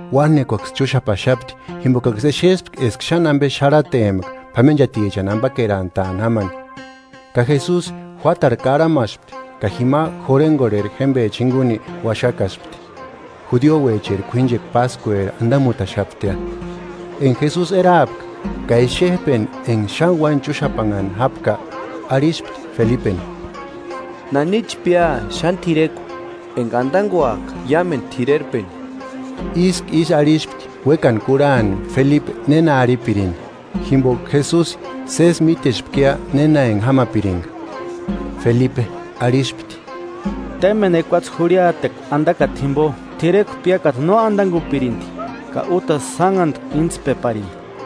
Uánekuaksï chúxapaxapti, jimbokaksï exespka eska xáni ambe xarhatempka p'amenchatichani ambakerantaani jámani. Ka Jesusi juátarhu karhamaspti ka jima jurhengorheri jémbecha jinguni uaxakaspti. Judiouecheri k'uínchekua páskueri andamutaxaptia. Enga Jesusi eraapka, ka exejpeni enga xáni uáni chúxapanhani jápka, arhispti Felipeni: –¿Nanichi pía xáni t'irekua enga andanguaka iámendu t'irerpeni? Ísku ísï arhispti uékani kurhani Felipe néna arhipirini, jimboka Jesusi sési mítespkia néna enga jámapiringa, Felipe arhispti: –Témbeni ekuatse jurhiatekua andakata jimbo t'irekua piákata no andangupirindi ka útasï sánhantku intspeparini.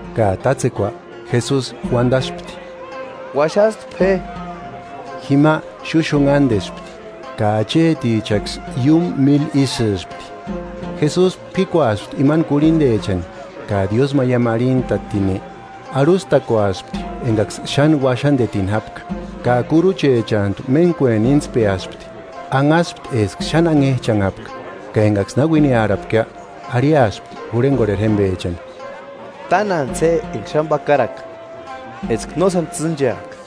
Ka tátsekua Jesusi uandaspti: –Uaxastpe je. Jima xúxunhandespti; ka achetichaksï iúmu míli isïspti. Jesusi p'íkuaspti imani kurhindechani, ka diósmaiamu arhintatini, arhustakuaspti engaksï xáni uaxandetini jápka; ka kuruchechantu méntkueni íntspeaspti, anhaspti eska xáni anhejchanhapka. Ka engaksï na uiniarhapkia, arhiaspti jurhengorheri jémbechani: –Tánantsï je enga xáni pakaraka, eska no sáni tsîncheaka.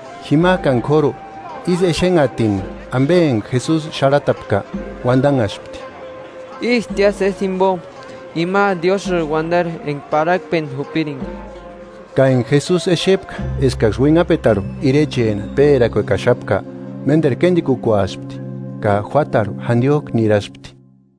Jimajkani kóru ísï exénhatini ambe enga Jesusi xarhatapka, uandanhaspti: –Ístia sési jimbo ima Diósïri uandari enga parhakpeni jupiringa. Ka enga Jesusi exepka eskaksï uinhapetarhu Irecheni pérakuekaxapka, ménderu kéndikukuaspti, ka juátarhu jandiojku niraspti.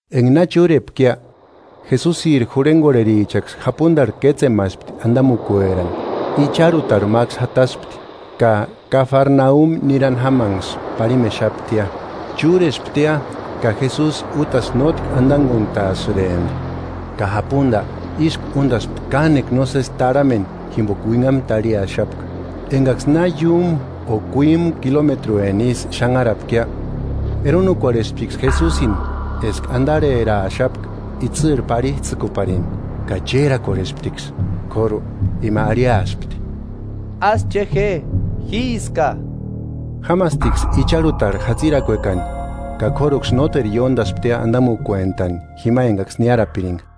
Enga na chúrepkia, Jesusiri jurhengorherichaksï japundarhu kétsemaspti andamukuerani, icharhutarhu máksï jataspti, ka Kafarnaumi nirani jámanksï parhimexaptia. Chúresptia ka Jesusi útasï nótki andanguntaasïrempti. Ka japunda ísku úndaspti kánekua nósesi tarhameni jimboka uinhamu tarhiaxapka. Engaksï na iúmu o kuímu kilometrueni isï xanharapkia, eronukorhesptiksï Jesusini eska andarheraaxapka itsïrhu parhijtsïkuparini, ka chérakorhesptiksï K'óru ima arhiaspti: –¡Ásï che je, jíska! Jámastiksï icharhutarhu jatsirakuekani, ka k'óruksï nóteru ióndasptia andamukuentani jima engaksï niárapiringa.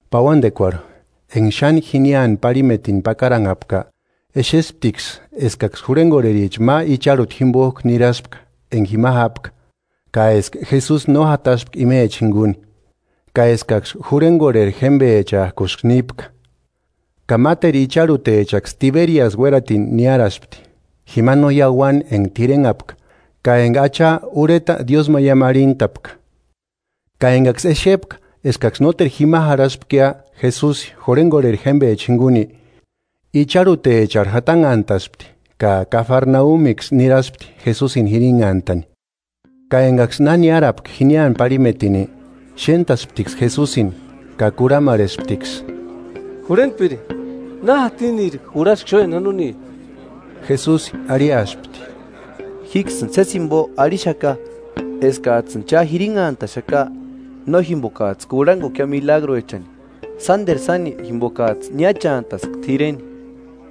Pauandekuarhu, enga xáni jiniani parhimetini pakaranhapka, exesptiksï eskaksï jurhengorhericha ma icharhuta jimbojku niraspka enga jima jápka, ka eska Jesusi no jataspka imechani jinguni, ka eskaksï jurhengorheri jémbechajkusï nípka. Ka máteru icharhutechaksï Tiberiasi uératini niáraspti, jima no iauani enga t'irenhapka ka enga Acha urheta diósmaiamu arhintapka. Ka engaksï exepka eskaksï nóteru jima jarhaspkia Jesusi jurhengorheri jémbecha jinguni, icharhutecharhu jatanhantaspti ka Kafarnaumiksï niraspti Jesusini jirinhantani. Ka engaksï na niárapka jiniani parhimetini, xéntasptiksï Jesusini ka kurhamarhesptiksï: –Jurhentpiri, ¿Na jatiniri jurhaski xúeni janoni? Jesusi arhiaspti: –Jíksïni sési jimbo arhixaka eskajtsïni cha jirinhantaxaka no jimbokajtsï kurhangukia milagruechani sánderu sáni jimbokajtsï niáchantaska t'ireni.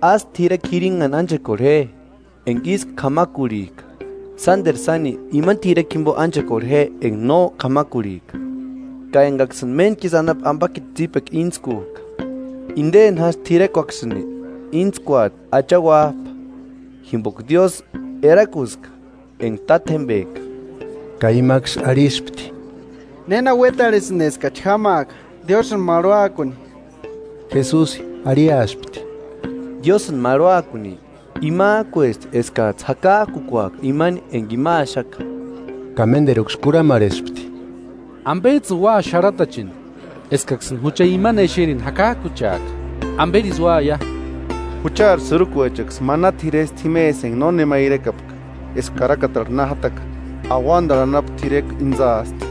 Ásï t'irekua jirinhani ánchekorhe je enga ísku k'amakurhijka, sánderu sáni imani t'irekua jimbo ánchekorhe je enga no k'amakurhijka ka engaksïni méntku isï anapu ambakiti tsípekua íntskujka. Indeni jásï t'irekuaksïni íntskuati Acha Uájpa, jimboka Diósï erakuska enga Tátjembeka. Ka imaksï arhispti: –¿Néna uétarhesïnki eskachi jámaaka Diósïni marhuakuni? Jesusi arhiaspti: –Diósïni marhuakuni imajkuesti eskajtsï jakajkukuaka imani enga ima axaka. Ka ménderuksï kurhamarhespti: –¿Ambejtsïni ua xarhatacheni, eskaksïni jucha imani exerini jakajkucheaka? ¿Amberisï úaia? Juchari sïrukuechaksï mana t'iresti jimesï enga no nema irekapka, eska karakatarhu na jataka: Auandarhu anapu t'irekua íntsaasti.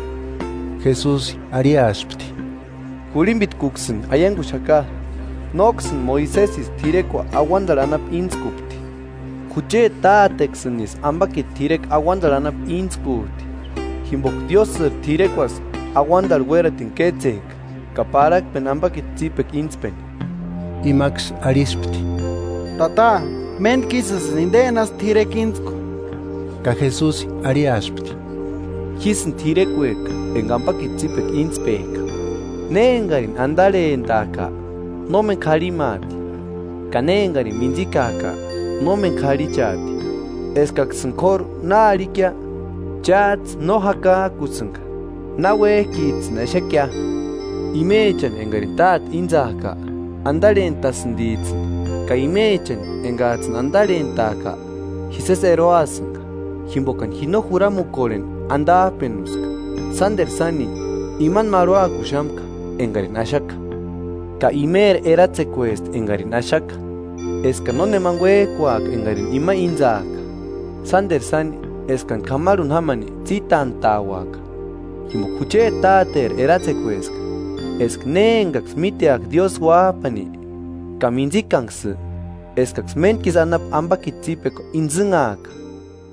Jesusi arhiaspti: –Jurhimbitkuksïni aianguxaka, nóksïni Moisesisï t'irekua auandarhu anapu íntskupti, jucheti Táteksïnisï ambakiti t'irekua auandarhu anapu íntskujti. Jimboka Diósïri t'irekuasï auandarhu uératini kétsejka ka parhakpeni ambakiti tsípekua intspeni. Imaksï arhispti: –Tata, méntkisïjtsïni indeni jásï t'irekua íntsku. Ka Jesusi arhiaspti: –Jísïni t'irekueka enga ambakiti tsípekua íntspejka. Ne engarini andarhentajka, nómeni k'arhimaati; ka ne engarini míntsikajka, nómeni k'arhichaati. Eskaksïni k'óru na arhikia, chájtsï no jakajkusïnga náuejkijtsïni exekia. Imechani engarini Táte íntsaajka andarhentasïndijtsïni; ka imechani engajtsïni andarhentajka, ji sési eroasïnga. Jimbokani ji no juramukorheni andajpenuska, sánderu sáni imani marhuakuxamka engarini axaka. Ka imeri eratsekuesti engarini axaka, eskani nónemani uéjkuaka engarini ima íntsaaka, sánderu sáni eskani k'amarhuni jámani tsítantauaka. Jimboka Jucheti Táteri eratsekueska, eska ne engaksï míteaka Diósï Uájpani ka mintsikanksï, eskaksï méntku isï anapu ambakiti tsípekua intsïnhaaka;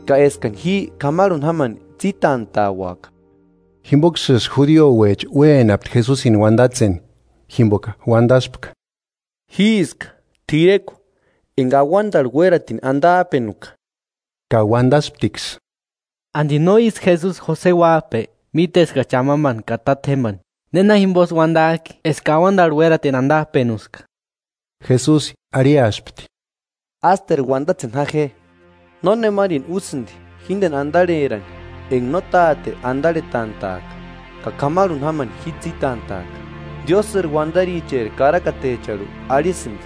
ka eskani ji k'amarhuni jámani tsítantauaka. Jimboksïsï Judiouecha uénapti Jesusini uandatseni, jimboka uandaspka: “Jíska t'irekua enga auandarhu uératini andajpenuka.” Ka uandasptiksï: –¿Andi no ísï Jesusi Jose uájpe? Míteskachi amambani ka tátjembani. ¿Néna jimbosï uandajki eska auandarhu úeratini andajpenuska? Jesusi arhiaspti: –Ásteru uandatseni ja je. Nónemarini úsïndi jíndeni andarherani, enga no Táte andarhetantajka; ka k'amarhuni jámani ji tsítantaaka. Diósïri uandaricheri karakatecharhu arhisïndi: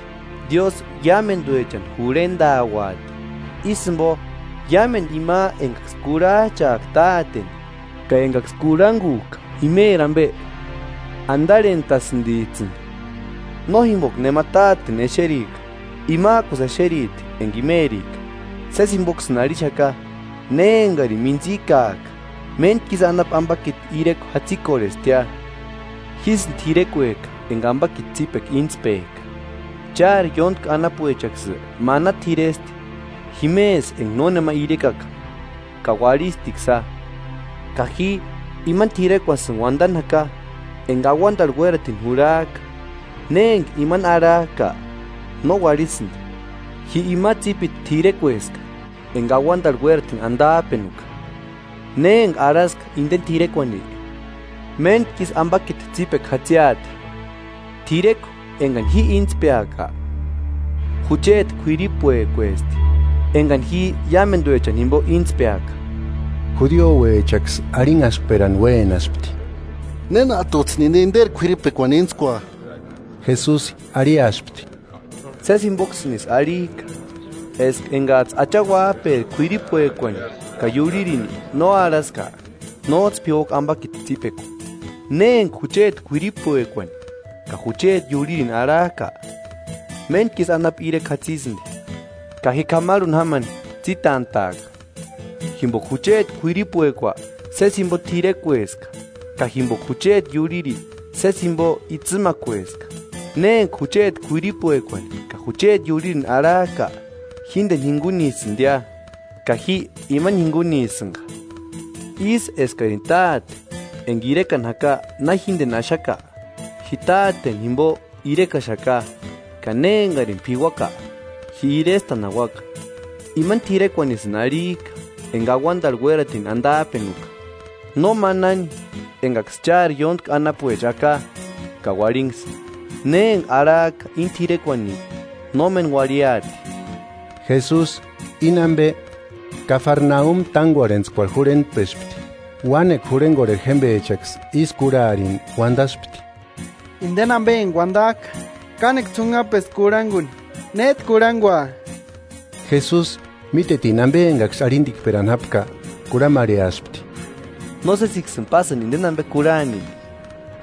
Diósï iámenduechani jurhendauati. Ísï jimbo iámendu ima engaksï kurhajchajka Táteni ka engaksï kurhangujka imeri ambe, andarhentasïndijtsïni. “No jimboka nema Táteni exerika; imajkusï exeriti enga imerika. Sési jimboksïni arhixaka, ne engarini mintsikajka, méntku isï anapu ambakiti irekua jatsikorhestia. Jísïni t'irekueka enga ambakiti tsípekua intspejka. Chári ióntki anapuechaksï mana t'iresti jimesï enga no nema irekaka, ka uarhistiksïa; ka ji imani t'irekuasïni uandani jaka enga auandarhu uératini jurhajka; ne enga imani arhajka, no uarhisïndi. Ji ima tsípiti t'irekueska enga auandarhu uératini andajpenuka; ne enga arhaska indeni t'irekuani, méntku isï ambakiti tsípekua jatsiati. T'irekua engani ji íntspeaka jucheti kuiripuekuesti. Engani ji iámenduechani jimbo íntspeaka.” Judiouechaksï arhinhaskperani uénaspti: –¿Nénajtujtsïni inde inderi k'uiripuekuani íntskua? Jesusi arhiaspti: –Sési jimboksïnisï arhijka eska engajtsï Acha Uájperi k'uiripuekuani ka iurhirini no arhaska, nójtsï p'iuaka ambakiti tsípekua. Ne enga jucheti k'uiripuekuani ka jucheti iurhirini arhajka, méntku isï anapu irekua jatsisïndi; ka ji k'amarhuni jámani tsítantaaka. Jimboka jucheti k'uiripuekua sési jimbo t'irekueska, ka jimboka jucheti iurhiri sési jimbo itsïmakueska. Ne enga jucheti k'uiripuekuani ka jucheti iurhirini arhajka, jíndeni jingunisïndia, ka ji imani jingunisïnga. Ísï eskarini Táte enga irekani jaka na jíndeni axaka, ji Táteni jimbo irekaxaka; ka ne engarini p'iuaka, ji irestani jauaka. Imani t'irekuanisïni arhijka enga auandarhu uératini andajpenuka. No manani engaksï chári ióntki anapuecha aka ka uarhinksï; ne enga arhajka íni t'irekuani no méni uarhiaati. Jesusi íni ambe, Kafarnaumi tángorhetskuecharhu jurhentpespti. Uánekua jurhengorheri jémbechaksï ísï kurharini uandaspti: –Indeni ambe enga uandajka kánekua ts'unhapesti kurhanguni; ¿Néjtu kurhangua? Jesusi mítetini ambe engaksï arhindikperani jápka, kurhamarheaspti: –¿Nósesiksïni pásïni indeni ambe kurhani?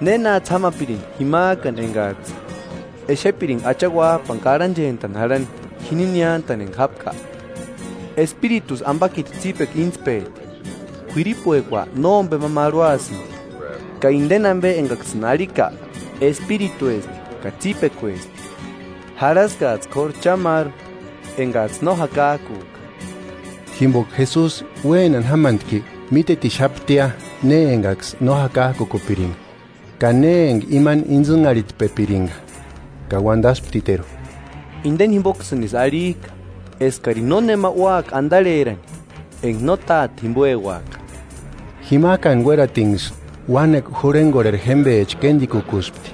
¿Nénajtsï jámapirini jimajkani engajtsï exepiringa Acha Uájpani karhanchentani jarhani jini niántani enga jápka? Espiritusï ambakiti tsípekua íntspejti; k'uiripuekua nómbema marhuasïndi. Ka indeni ambe engaksïni arhika espirituesti ka tsípekuesti. Jarhaskajtsï k'óru cha máru engajtsï no jakajkujka. Jimboka Jesusi uénani jámantki mítetixaptia ne engaksï no jakajkupiringa ka ne enga imani intsïnharhitpepiringa. Ka uandasptiteru: –Indeni jimboksïnisï arhijka eskarini nónema úaka andarherani, enga no Táte jimboeuaka. Jimajkani uératinksï uánekua jurhegorheri jémbecha kéndikukuspti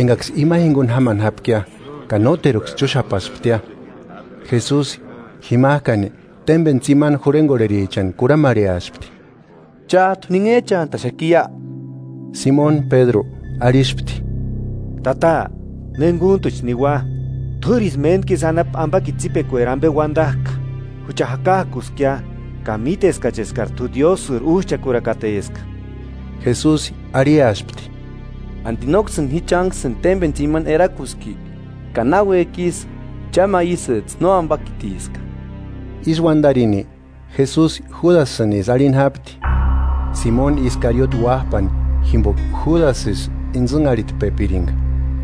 engaksï ima jinguni jámani jápkia, ka nóteruksï chúxapasptia. Jesusi jimajkani témbeni tsimani jurhengorherichani kurhamarheaspti: –¿Chájtu ninhejchantaxakiia? Simoni Pédru arhispti: –Tata, ¿Nénguntuchi niua? T'úrisï méntku isï anapu ambakiti tsípekueri ambe uandajka. Jucha jakajkuskia ka míteskachi eskari t'u Diósïri Újchakurakateska. Jesusi arhiaspti: ¿Andi nóksïni ji chánksïni témbeni tsimani erakuski? Ka náuejki isï, cha ma isïjtsï nóambakitiska. Ísï uandarini, Jesusi Júdasïnisï arhini jápti, Simoni Iskariote uájpani, jimboka Júdasisï intsïnharhitpepiringa,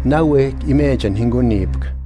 náuejki imechani jingunipka.